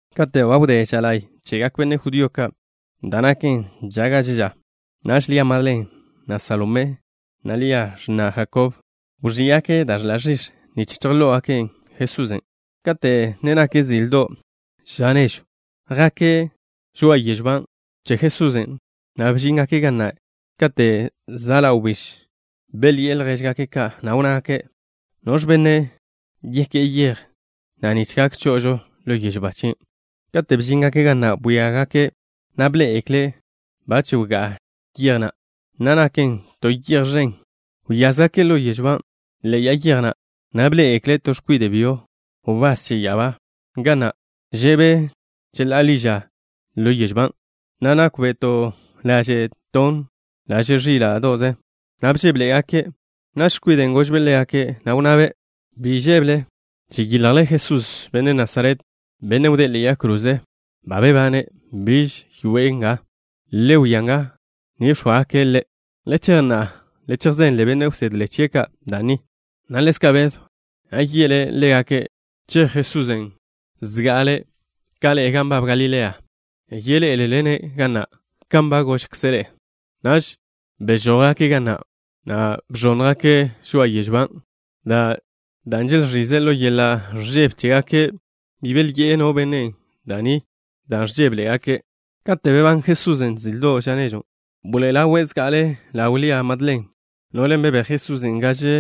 Kate' ba wdé ža la'y chegak benne' judío ka', da' naken ža gaže ža, naž Lia Madlen, na' Salomé, na' Lia, x̱na' Jakob, wẕí'gake' da' ẕḻa' ẕix̱ nich chejló'ogake' Jesusen' da' ẕix̱en'. Kate' ne nak zildo' ža nežw, jake' žoa'a yežw ba che Jesusen', na' bžíngake' ga na' kate' za' ḻa' wbíž. Belyi'e ljéžgake' ka', na' wnnágake': —¿Noẕ benne' yeké'e yej na' nich gak cho'ožo ḻo yežw ba chien'? Kate' bžíngake' ga na', bwíagake', na' bḻé'egekle' ba nkwas yej na', na' naken to yej ẕen. Wyázgake' ḻo yežw ba ḻe'e ya'a yej na', na' bḻé'egekle' to x̱kwide' byo, wbás che ya'abá ga na'. Že'be' cheḻá'a ḻi ža ḻo yežw ban', na' nákwbe' to laže' tonn, laže' ẕíla'do'ze, na' bžébeḻe'egake'. Naž x̱kwiden' gožbe' ḻégake', na' wnnabe': —Biž žébele. Žeyiljle Jesusen', Benne' Nasaret, Bennen' wdé'e ḻe'e yag kroze. Ba bebane'. Biž zoe' nga. Le wia ga ni bx̱óagake' Ḻe'. Le chej na'a, le chejzenle benne' wsedle chie' ka' da' ni, na' ḻezka' Bedw, na' ye'le ḻégake': “Chej Jesusen' zga'ale' ka ḻe'e gan nbab Galilea. Yeḻé'elele-ne' ga na' kan ba gožkze' ḻe'e.” Naž bežójgake' ga na', na' bẕónnjgake' žoa'a yežw ban' dan' želẕize' ḻo yeḻa' ẕžebe chégake'. Bi belyi'e no benne' da' ni dan' ẕžébeḻe'egake'. Kate' bebán Jesusen' zildo' ža nežwn', bḻoe'e ḻawe' zga'ale ḻaw Lia Madlen, no'len' bebéj Jesusen' gaže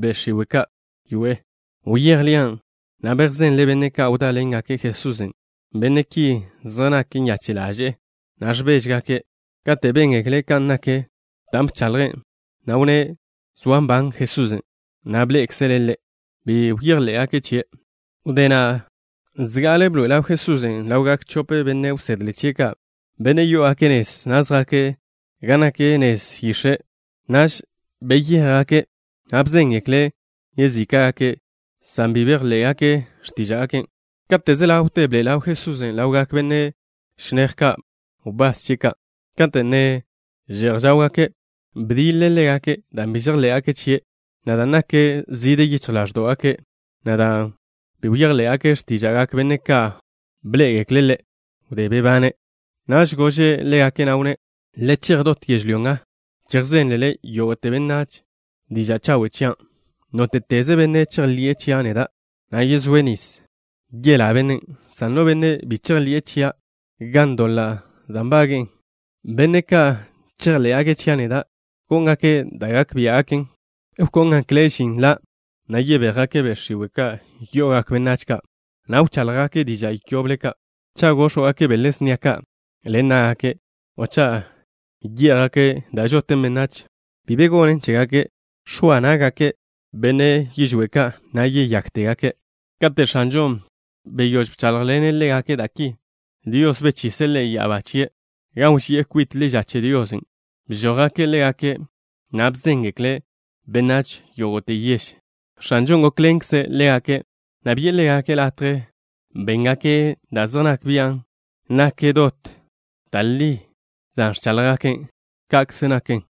be' x̱iwe' ka' wyoé'e. Wyéj Lian', na' bejzenlen' benne' ka' wdáḻengake' Jesusen'. Benne' ki zej nak nyache' ḻaže'e, na' ẕbéžegake'. Kate' béngekle' kan nak da' bchaḻje', na' wnné' zoa nban Jesusen', na' bḻé'ekzele' Ḻe', bi bejḻé'gake' chie'. Wdé na', nža'le bḻoe'e ḻaw Jesusen' ḻawgak chope benne' wsedle chie' ka', benne' yó'ogake' nez, na' zjake' gan nak nez yix̱e'. Naž beyéjgake', na' bejzéngeklen' yezíka'gake', san bi bejḻé'gake' x̱tíža'gake'. Kate' ze ḻawte, bḻoe'e ḻaw Jesusen' ḻawgak benne' chinéj, benne' wbás chie' ka', kate' ne že'j žáwgake'. Bdiḻe' ḻégake' dan' bi žejḻé'gake' chie', na' dan' nak zide yichj ḻáẕdo'gake', na' dan' bi bejḻé'gake' x̱tíža'gak benne' ka' bḻé'egekle' Ḻe' wdé bebane'. Naž gože' ḻégake', na' wnné': —Le chej dot yežlyó nga, chejzénlele yógo'te benách diža' chawe' chian'. Nóte'teze benne' chejḻi'e chia' neda', na' yezóe' nis, yelá bennen', san no benne' bi chejḻi'e chia', ga'n doḻa' da' nbage'e. Benne' ka' chejḻé'gake' chia' neda' góngake' da' gak biá'gaken. Wkóngekle' žin la', na' yebéjgake' be' x̱iwe' ka' yo'ogak benách ka', na' wcháḻjgake' diža' yoble ka'. Cha' góx̱wgake' bele snia ka' ḻen ná'gake', o cha' yé'jgake' da' žoten benách, bi be gonen chégake'. X̱oa ná'gake' benne' yižwé' ka', na' yeyáktegake'. Kate' X̱anžon' beyóž bcháḻjḻene' ḻégake' da' ki, Dios bechise' Ḻe' ya'abá chie', gan wži'e kwit ḻi ža che Dios. Bžójgake' ḻégake', na' bejzéngekle' benách yógo'te yež. X̱anžon' gókḻenkze' ḻégake', na' bi'e ḻégake' latje béngake' da' zej nak bian' nak dot da' li da' ẕcháḻjgake'. Ka'kze naken.